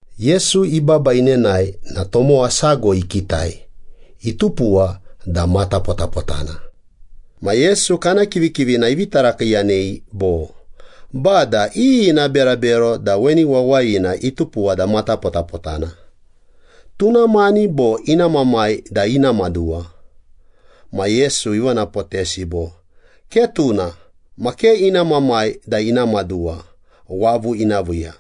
Yesu ibaba inenae na tomowa sago ikitai, itupuwa da matapotapotana. Ma Yesu kana kivikivina ivi tarakiiyanei bo, “Bada, iyi ina berabero da weni wawayina itupuwa da matapotapotana? Tuna mani bo ina mamai da ina maduwa?” Ma Yesu ivonapotesi bo, “Ke tuna, ma ke ina mamai da ina maduwa wavu ina viiya.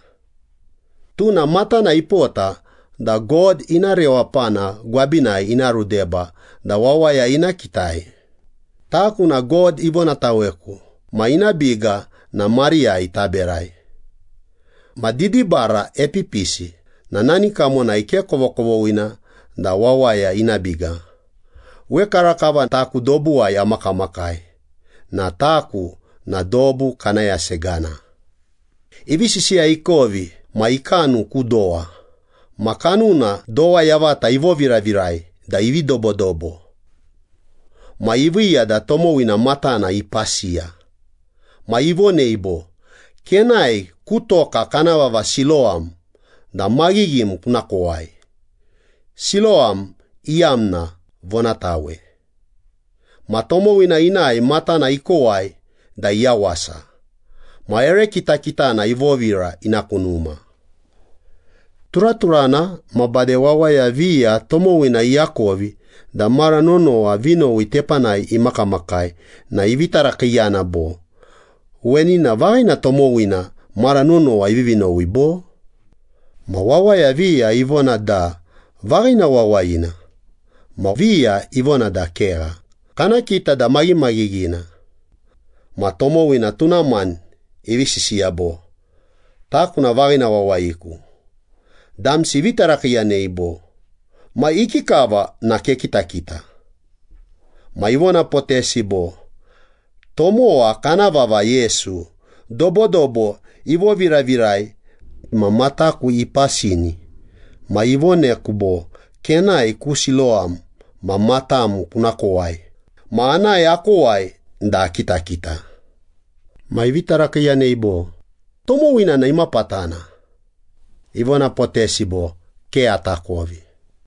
Tuna matana ipota da God ina rewapana gwabinai ina rudeba da wawaya ina kitai. Taku na God ivonataweku ma ina biga na mariyai taberai. Ma didibara epipisi na nani kamonai ke kovokovoghina da wawaya ina biga. Wekarakava taku dobuwai amakamakai na taku na dobu kana yasegana.” Ivi sisiya ikovi ma ikanu ku dowa, ma kanuna dowa yavata ivoviravirai da ivi dobodobo. Ma iviiya da tomowina matana ipasiya. Ma ivonei bo, “Kenae ku toka kana vava Silowam da maghighim kuna kowai.” Silowam iyamna ‘Vonatawei.’ Ma tomowina inae matana ikowai da iyawasa. Ma ere kitakitana ivovira ina ku numa. Turaturana ma bade wawaya viya tomowina iakovi da mara nonowa vinowi tepanai imakamakai na ivi tarakiiyana bo, “Weni na vaghina tomowina mara nonowa ivivi nowi bo?” Ma wawaya viya ivona da vaghina wawayina, ma viya ivona da kegha, kana kita da maghimaghighina. Ma tomowina tuna mani ivi sisiya bo, “Taku na vaghina wawayiku.” Damsi ivi tarakiiyanei bo, “Ma ikikava na kekitakita?” Ma ivonapotesi bo, “Tomowa kana vava Yesu dobodobo ivoviravirai ma mataku ipasini ma ivoneku bo, ‘Kenae ku Silowam ma matam kuna kowai.’ Ma anae akowai da akitakita.” Ma ivi tarakiiyanei bo, “Tomowina na imapatana?” Ivonapotesi bo, “Ke atakovi.”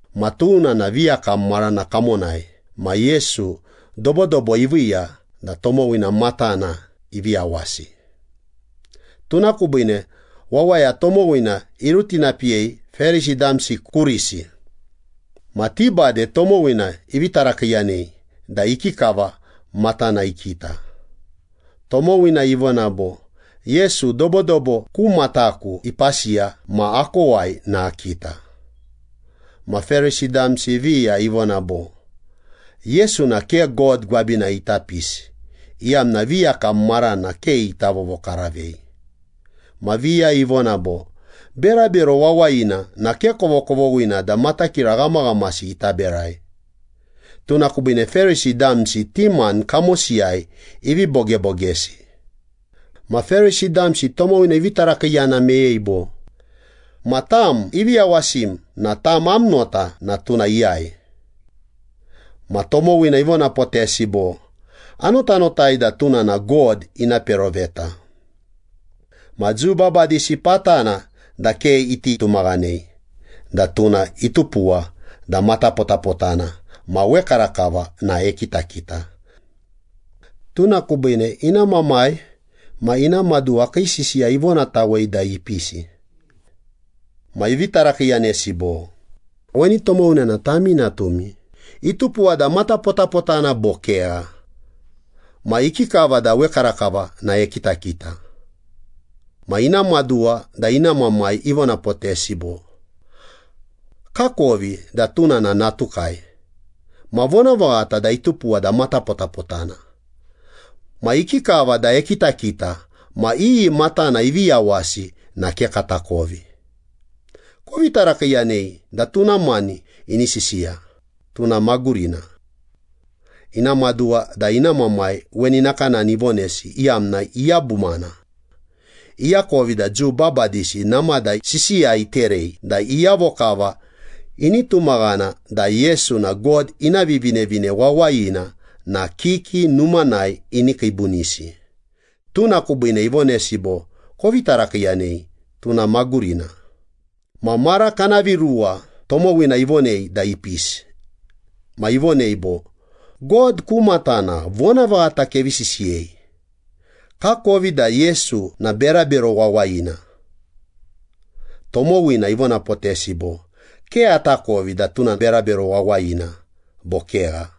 Ma tuna na viyakam marana kamonai ma Yesu dobodobo iviiya da tomowina matana ivi yawasi. Tuna kubiine wawaya tomowina irutinapiyei Perisi damsi kurisi. Ma ti bade tomowina ivi tarakiiyanei da ikikava matana ikita. Tomowina ivona bo, “Yesu dobodobo ku mataku ipasiya ma akowai na akita.” Ma Perisi damsi viya ivona bo, “Yesu na ke God gwabinai ita pisi, iyamna viyakam marana ke ita vovokaravei.” Ma viya ivona bo, “Berabero wawayina na ke kovokovoghina da matakira ghamaghamasi ita berai.” Tuna kubiine Perisi damsi ti mani kamosiyai ivi bogebogesi. Ma Perisi damsi tomowina ivi tarakiiyana meyei bo, “Ma tam ivi yawasim na tam am nota na tuna iyai?” Ma tomowina ivonapotesi bo, “Anotanotai da tuna na God ina peroveta.” Ma Jiu babadisi patana da ke iti tumaghanei da tuna itupuwa da matapotapotana ma wekarakava na ekitakita. Tuna kubiine ina mamai ma ina maduwa kii sisiya ivonatawei da ipisi. Ma ivi tarakiiyanesi bo, “Weni tomowina na tami natumi, itupuwa da matapotapotana bo kegha? Ma ikikava da wekarakava na ekitakita?” Ma ina maduwa da ina mamai ivonapotesi bo, “Kakovi da tuna na natukai, ma vonavaghata da itupuwa da matapotapotana. Ma ikikava da ekitakita ma iyi matana ivi yawasi na ke katakovi. Kovi tarakiiyanei da tuna mani ini sisiya, tuna magurina.” Ina maduwa da ina mamai weni nakanani ivonesi, iyamna iyabumana. Iakovi da Jiu babadisi namada sisiya iterei da iyavo kava ini tumaghana da Yesu na God ina Vivinevine Wawayina na kiki numanai ini kiibunisi. Tuna kubiine ivonesi bo, “Kovi tarakiiyanei, tuna magurina.” Ma mara kana viruwa tomowina ivonei da ipisi. Ma ivonei bo, “God ku matana vonavaghata kevi sisiyei. Kakovi da Yesu na berabero wawayina.” Tomowina ivonapotesi bo, “Ke atakovi da tuna berabero wawayina bo kegha.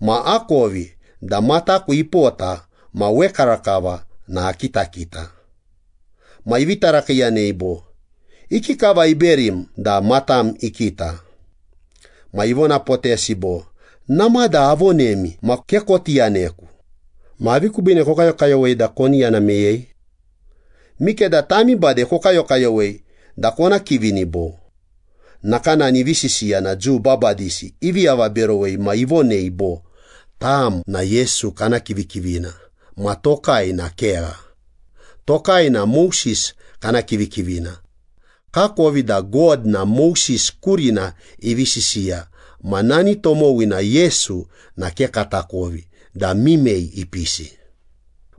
Ma akovi da mataku ipota ma wekarakava na akitakita.” Ma ivi tarakiiyanei bo, “Ikikava iberim da matam ikita?” Ma ivonapotesi bo, “Namada avonemi ma ke koti yaneku. Ma avi kubiine kokayokayowei da koni yana meyei? Mikeda tami bade kokayokayowei da kona kivini bo?” Nakanani ivi sisiya na Jiu babadisi ivi avaberowei ma ivonei bo, “Tam na Yesu kana kivikivina, ma tokai na kegha. Tokai na Moses kana kivikivina. Kakovi da God na Moses kurina ivi sisiya ma nani tomowina Yesu na ke katakovi da mimei ipisi.”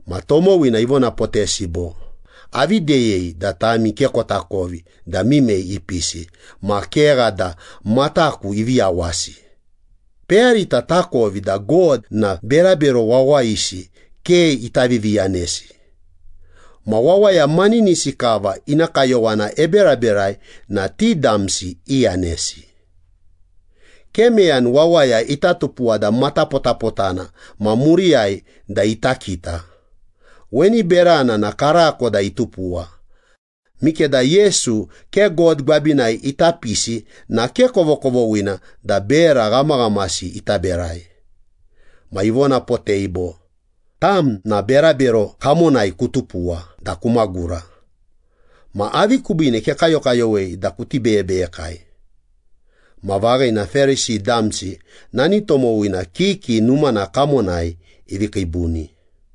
Ma tomowina ivonapotesi bo, “Avi deyei da tami ke kotakovi da mimei ipisi ma kegha da mataku ivi yawasi. Peyarita takovi da God na berabero wawayisi ke ita viviyanesi. Ma wawaya maninisi kava ina kayowana eberaberai na ti damsi iyanesi. Ke meyani wawaya ita tupuwa da matapotapotana ma muriyai da ita kita. Weni berana na karako da itupuwa. Mikeda Yesu ke God gwabinai ita pisi na ke kovokovoghina da bera ghamaghamasi ita berai.” Ma ivonapotei bo, “Tam na berabero kamonai kutupuwa da kumagura. Ma avi kubiine kekayokayowei da kuti beyebeyekai?” Ma vaghina Perisi damsi nani tomowina kiki numana kamonai ivi kiibuni.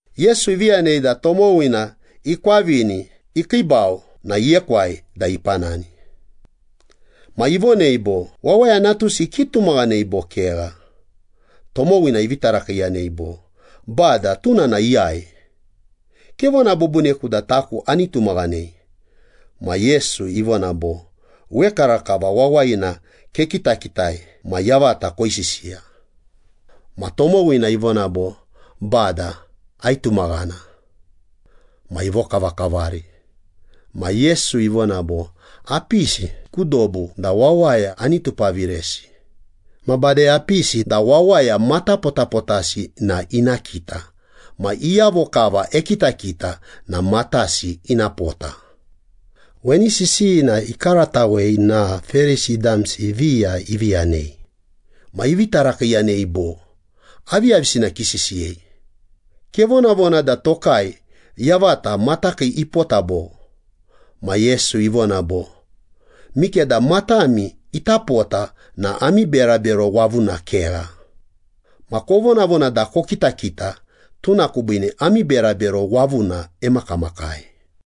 Yesu ivi yanei da tomowina ikwavini ikiibau na iekwai da ipanani. Ma ivonei bo, “Wawaya Natusi kitumaghanei bo kegha?” Tomowina ivi tarakiiyanei bo, “Bada, tuna na iyai? Kevona bubuniku da taku ani tumaghanei.” Ma Yesu ivona bo, “Wekarakava wawayina kekitakitai ma yavata koisisiya.” Ma tomowina ivona bo, “Bada, aitumaghana.” Ma ivokavakavari. Ma Yesu ivona bo, “Apisi ku dobu da wawaya ani tupaviresi. Ma bade apisi da wawaya matapotapotasi na ina kita ma iyavo kava ekitakita na matasi ina pota.” Weni sisiyina ikaratawei na Perisi damsi viya ivi yanei. Ma ivi tarakiiyanei bo, “Aviyavisina kisisiyei? Kevonavona da tokai yavata matakii ipota bo?” Ma Yesu ivona bo, “Mikeda matami ita pota na ami berabero wavuna kegha. Ma kovonavona da kokitakita, tuna kubiine ami berabero wavuna emakamakai.”